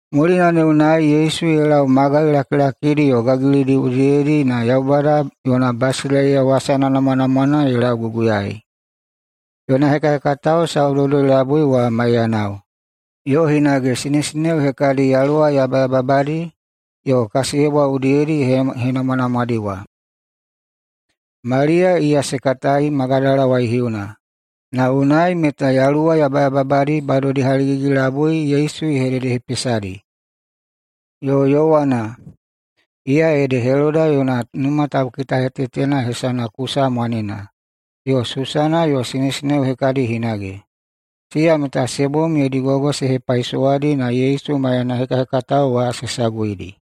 Mulina ne unai Yesu ye lau magai lakilakidi yo gagilidi udiyedi na Yaubada yona basileiya wasana namwanamwana ye laulauguguyai. Yona hekahekatao saudoudoi-labui wa maiyanao, yo hinage sinesineo hekadi yaluwa yabayababadi yo kasiyebwa udiyedi ye henamwanamwadi wa: Maliya, iya se katai Magadala waihiuna, na unai meta yaluwa yabayababadi badodi haligigi-labui Yesu ye hededehepesadi, yo Yowana, iya ede Heloda yona numa taukitahetetena hesana Kusa mwanena, yo Susana, yo sinesineo hekadi hinage. Siya meta se bom yodi gogo se hepaisowadi na Yesu maiyana hekahekatao wa se saguidi.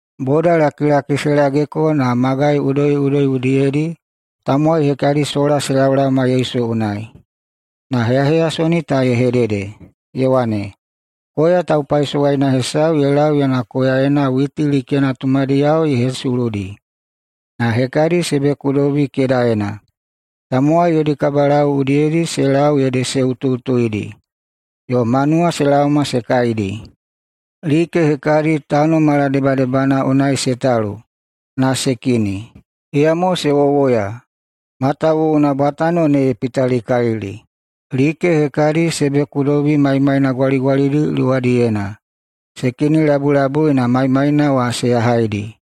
Bodalakilaki se lageko na magai udoiꞌudoi udiyedi tamowai hekadiyo sola se laolaoma Yesu unai, na heyaheyasoni ta ye hedede, ye wane, “Koya taupaisowaina hesau ye lau yona koyaena witi likena tumadiyao ye hesuludi. Na hekadi se bekudobi kedaena. Tamowai yodi kabalau udiyedi se lau ede se utuꞌutuidi, yo manuwa se laoma se kaidi. Like hekadi tano maladebadebana unai se talu na se kini. Iyamo se wowoya, matawuwuna bwatano ne ye pitalikalili. Like hekadi se bekudobi maimaina gwaligwalidi luwadiyena. Se kinilabulabui na maimaina wa se yahaidi.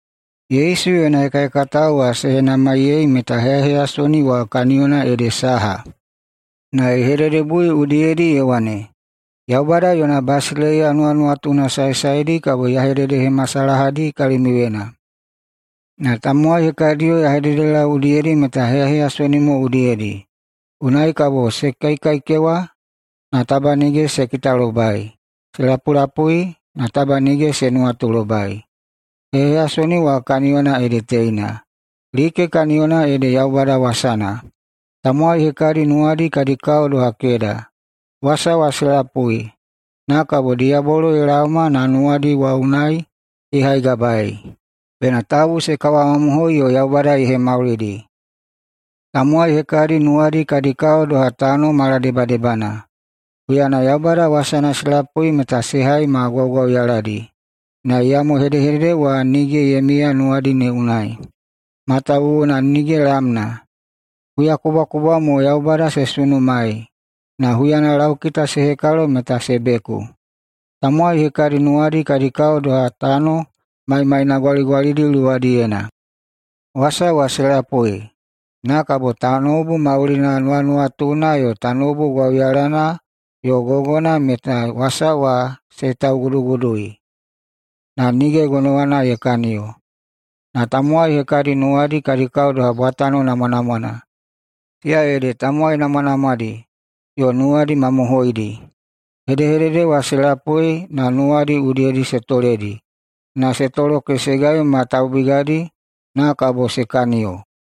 Yesu yona hekahekatao wa se henamaiyei meta heyaheyasoni wa kaniyona ede saha. Na ye hededebui udiyedi ye wane, “Yaubada yona basileiya nuwanuwatuna saesaedi kabo ya hededehemasalahadi kalimiuyena. Na tamowai hekadiyo ya hededelau udiyedi meta heyaheyasoni mo udiyedi, unai kabo ‘se kaikaikewa, na taba nige se kitalobai, yo se lapulapui, na taba nige se nuwatulobai.’ Heyaheyasoni wa kaniyona ede teina: Like kaniyona ede Yaubada wasana. Tamowai hekadi nuwadi kadi kao doha keda. Wasa wa se lapui, na kabo diyabolo ye laoma na nuwadi wa unai ye haigabaei, bena tabu se kawamamohoi yo Yaubada ye hemaulidi. Tamowai hekadi nuwadi kadi kao doha tano maladebadebana. Huyana Yaubada wasana se lapui meta se hai ma gwaugwauyaladi, na iyamo hedehedede wa nige ye miya nuwadi ne unai, matawuwuna nige lamna. Huyakubwakubwa mo Yaubada se sunumaei, na huyana laukita se hekalo meta se beku. Tamowai hekadi nuwadi kadi kao doha tano maimaina gwaligwalidi luwadiyena. Wasa wa se lapui, na kabo tanoubu maulina nuwanuwatuna yo tanoubu gwauyalana yo gogona meta wasa wa se taugudugudui, na nige gonowana ye kaniyo. Na tamowai hekadi nuwadi kadi kao doha bwatano namwanamwana, siya ede tamowai namwanamwadi yo nuwadi mamohoidi. Hedehedede wa se lapui na nuwadi udiyedi se toledi na se tolokesegai ma taubigadi na kabo se kaniyo.”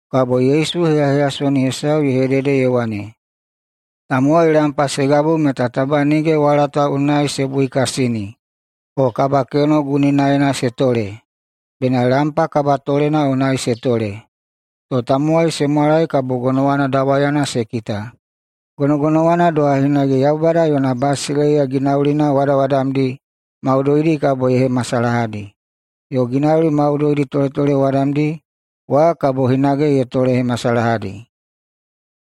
[Kabo Yesu heyaheyasoni hesau ye hedede ye wane,] “Tamowai lampa se gabu meta taba nige walata unai se buikasini o kabakeno guninaena se tole. Bena lampa kabatolena unai se tole, to tamowai se mwalai kabo gonowana dawayana se kita. Gonogonowana doha hinage Yaubada yona basileiya ginaulina wadawadamdi maudoidi kabo ye hemasalahadi, yo ginauli maudoidi toletolewadamdi wa kabo hinage ye tolehemasalahadi.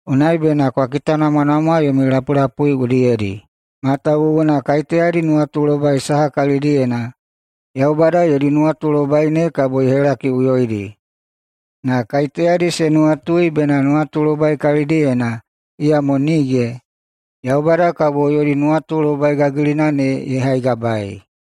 Unai bena kwa kitanamwanamwa yomi lapulapui udiyedi, matawuwuna kaiteyadi nuwatulobai saha kalidiyena, Yaubada yodi nuwatulobai ne kabo ye helakiꞌuyoidi. Na kaiteyadi se nuwatui bena nuwatulobai kalidiyena, na iyamo nige, Yaubada kabo yodi nuwatulobai gagilina ne ye haigabaei.”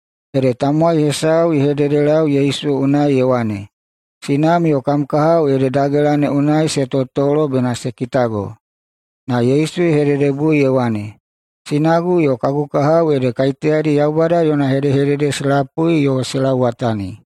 Ede tamowai hesau ye hededelau Yesu unai ye wane, “Sinam yo kam kahao ede dagela ne unai se totolo bena se kitago.” Na Yesu ye hededebui ye wane, “Sinagu yo kagu kahao ede kaiteyadi Yaubada yona hedehedede se lapui yo se lauwatani.”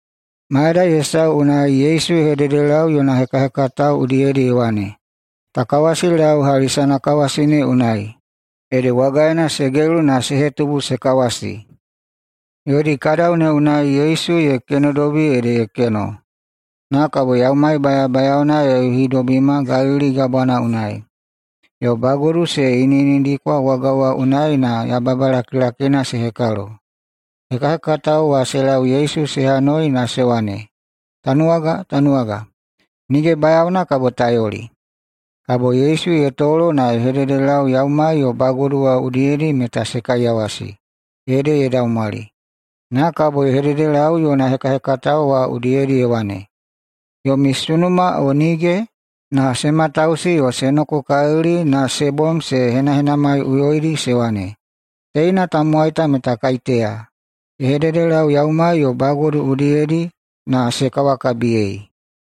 Mayadai hesau unai Yesu ye hededelau yona hekahekatao udiyedi ye wane, “Ta kawasilau hali sanakawasi ne unai.” Ede wagaena se gelu na se hetubu se kawasi. Yodi kadau ne unai Yesu ye kenodobi ede ye keno. Na kabo yaumai bayabayaona ye yuhidobima Galili Gabwana unai. Na bagodu se iniꞌinidikwa waga wa unai na yababa lakilakina se hekalo. Hekahekatao wa se lau Yesu se hanoi na se wane, “Tanuwaga! Tanuwaga! Nige bayaona kabo ta yoli!” Kabo Yesu ye tolo na ye hededelau yaumai yo bagodu wa udiyedi meta se kaiyawasi, ede ye daumwali. Na kabo ye hedehededelau yona hekahekatao wa udiyedi ye wane, “Yomi sunuma, o nige?” Na se matausi yo se nokokalili na se bom se henahenamaiꞌuyoidi se wane, “Teina tamowai ta meta kaiteya? Ye hededelau yaumai yo bagodu udiyedi na se kawakabiyei.”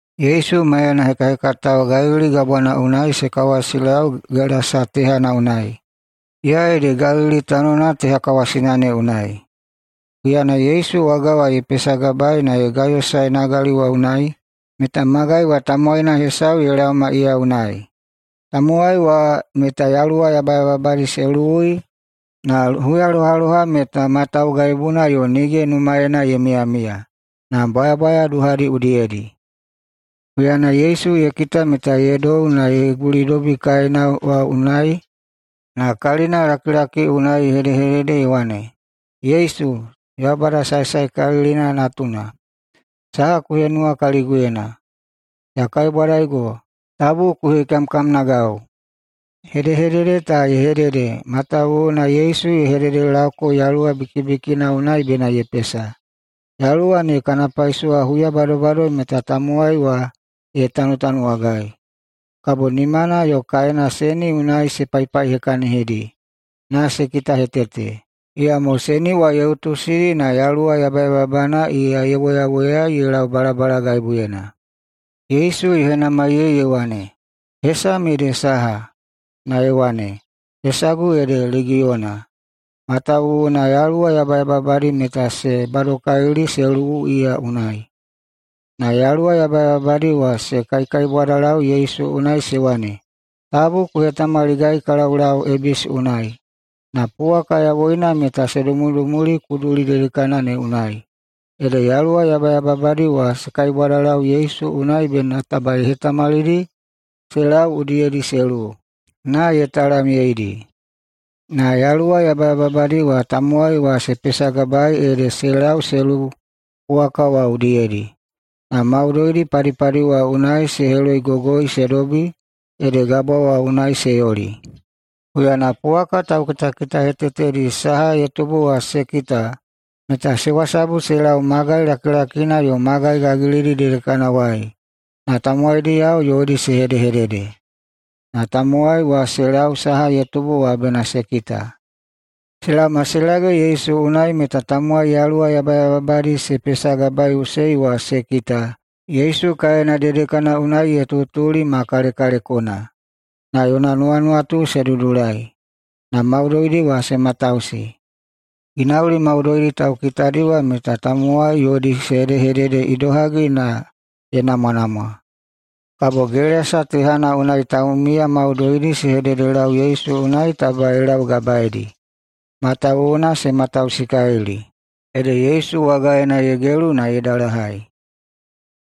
Yesu maiyana hekahekatao Galili Gabwana unai se kawasilau Gelasa tehana unai, iya ede Galili tanona teha kawasina ne unai. Huyana Yesu waga wa ye pesagabaei na ye gayosae nagali wa unai meta magai wa tamowaina hesau ye laoma iya unai. Tamowai wa meta yaluwa yabayababadi se luwui na huyalohaloha meta ma taugaibuna yo nige numaena ye miyamiya, na bwayabwaya duhadi udiyedi. Huyana Yesu ye kita meta ye dou na ye gulidobi kaena wa unai na kalinalakilaki unai ye hedehedede ye wane, “Yesu, Yaubada Saesaekalilina natuna, saha ku henuwa kaliguyena? Ya kaibwadaigo, tabu ku hekamkamnagau.” Hedehedede ta ye hedede matawuwuna Yesu ye hededelauko yaluwa bikibikina ne unai bena ye pesa. Yaluwa ne kana paisowa huya badobado meta tamowai wa ye tanutanuwagai, kabo nimana yo kaena seni unai se paipaihekahekahinidi na se kitahetete, iyamo seni wa ye utusidi na yaluwa yabayababana iya ye woyawoyai ye lau balabalagaibuyena. Yesu ye henamaiyei ye wane, “Hesam ede saha?” Na ye wane, “Hesagu ede Legiyona.” Matawuwuna yaluwa yabayababadi meta se badokalili se luwu iya unai. Na yaluwa yabayababadi wa se kaikaibwadalau Yesu unai se wane, “Tabu ku hetamaligai ka laulau ebisi unai.” Na puwaka yawoina meta se dumudumuli kuduli dedekana ne unai. Ede yaluwa yabayababadi wa se kaibwadalau Yesu unai bena taba ye hetamalidi se lau udiyedi se luwu, na ye talamyeidi. Na yaluwa yabayababadi tamowai wa se pesagabaei ede se lau se luwu puwaka wa udiyedi, na maudoidi padipadi wa unai se heloigogoi se dobi ede gabwa wa unai se yoli. Huyana puwaka taukitakitahetetedi saha ye tubu wa se kita meta se wasabu se lau magai lakilakina yo magai gagilidi dedekanawai na tamowaidiyao yodi se hedehedede. Na tamowai wa se lau saha ye tubu wa bena se kita. Se laoma se lage Yesu unai meta tamowai yaluwa yabayababadi se pesagabaeiꞌusei wa se kita Yesu kaena dedekana unai ye tutuli ma kalekalekona, yo yona nuwanuwatu se dudulai. Na maudoidi wa se matausi. Ginauli maudoidi taukitadi meta tamowai yodi se hedehedede idohagi na ye namwanamwa. Kabo Gelasa tehana ne unai taumiya maudoidi se hededelau Yesu unai taba ye laugabaedi, matawuwuna se matausikalili. Ede Yesu wagaena ye gelu na ye dalahai.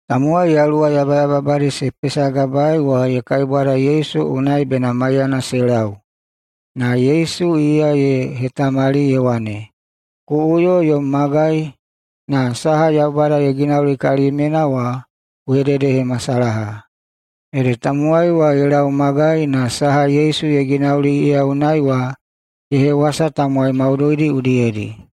Tamowai yaluwa yabayababadi se pesagabaei wa ye kaibwada Yesu unai bena maiyana se lau. Na Yesu iya ye hetamali, ye wane, “Ku uyo yom magai na saha Yaubada ye ginauli kalimyena wa ku hededehemasalaha.” Ede tamowai wa ye lau magai na saha Yesu ye ginauli iya unai wa ye hewasa tamowai maudoidi udiyedi.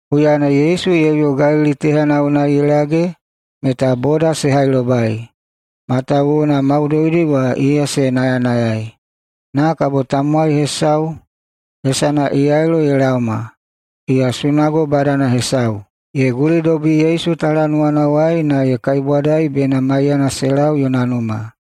Huyana Yesu ye uyo Galili tehana unai ye lage meta boda se hailobai, matawuwuna maudoidi wa iya se nayanayai. Na kabo tamowai hesau hesana Yailo ye laoma. Iya sunago badana hesau. Ye gulidobi Yesu talanuwanawai na ye kaibwadai bena maiyana se lau yona numa,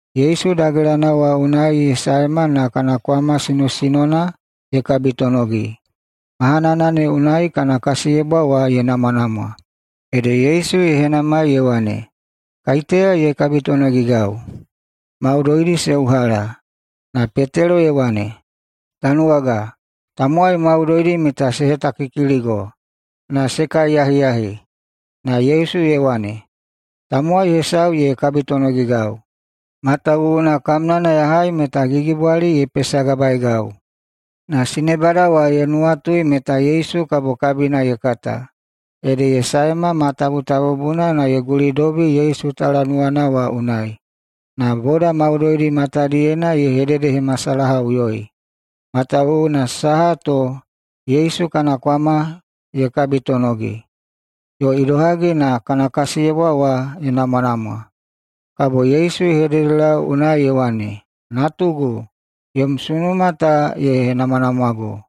Yesu dagelana wa unai ye saema na kana kwama sinosinona ye kabitonogi. Mahanana ne unai kana kasiyebwa wa ye namwanamwa. Ede Yesu ye henamai ye wane, “Kaiteya ye kabitonogigau?” Maudoidi se uhala. Na Petelo ye wane, “Tanuwaga, tamowai maudoidi meta se hetakikiligo na se kaiyahiyahi.” Na Yesu ye wane, “Tamowai hesau ye kabitonogigau, matawuwuna kamnana ya hai meta gigibwali ye pesagabaegau.” Na sinebada wa ye nuwatui meta Yesu kabo kabina ye kata, ede ye sae ma tabutabubuna na ye gulidobi Yesu talanuwana wa unai. Na boda maudoidi matadiyena ye hededehemasalahaꞌuyoi, matawuwuna saha to Yesu kana kwama ye kabitonogi, yo idohagi na kana kasiyebwa wa ye namwanamwa. Kabo Yesu ye hededelau unai ye wane, “Natugu, yom sunuma ta ye henamwanamwago.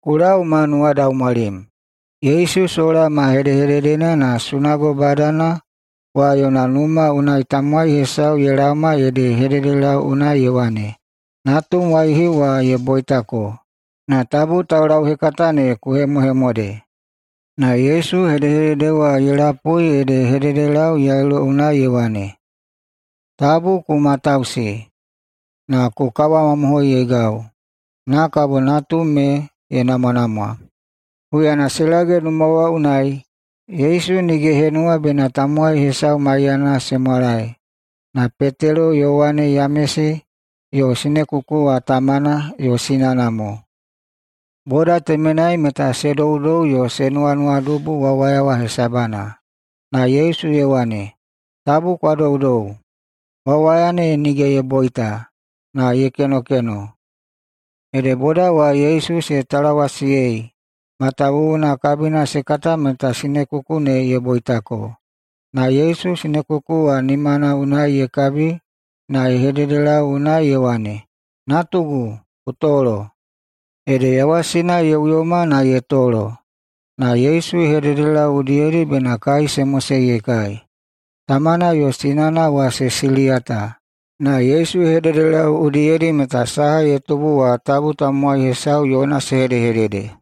Ku lau ma nuwadaumwalim.” Yesu sola ma hedehededena na sunago badana wa yona numa unai tamowai hesau ye laoma ede ye hededelau unai ye wane, “Natum waihiu wa ye boitako, na tabu taulauhekata ne ku hemohemode.” Na Yesu hedehedede wa ye lapui ede ye hededelau Yailo unai ye wane, “Tabu ku matausi, na ku kawamamohoiyeigau, na kabo natum ne ye namwanamwa.” Huyana se lage numa wa unai, Yesu nige ye henuwa bena tamowai hesau maiyana se mwalae, na Petelo, Yowane, Yamesi, yo sinekuku wa tamana yo sinana mo. Boda temenai meta se doudou yo se nuwanuwadubu wawaya wa hesabana. Na Yesu ye wane, “Tabu kwa doudou! Wawaya ne nige ye boita, na ye kenokeno.” Ede boda wa Yesu se talawasiyei, matawuwuna kabina se kata meta sinekuku ne ye boitako. Na Yesu sinekuku wa nimana unai ye kabi na ye hededelau unai ye wane, “Natugu, ku tolo!” Ede yawasina ye uyoma na ye tolo. Na Yesu ye hededelau udiyedi bena kai se mosei ye kai. Tamana yo sinana wa se siliyata. Na Yesu ye hededelau udiyedi meta saha ye tubu wa tabu tamowai hesau yona se hedehedede.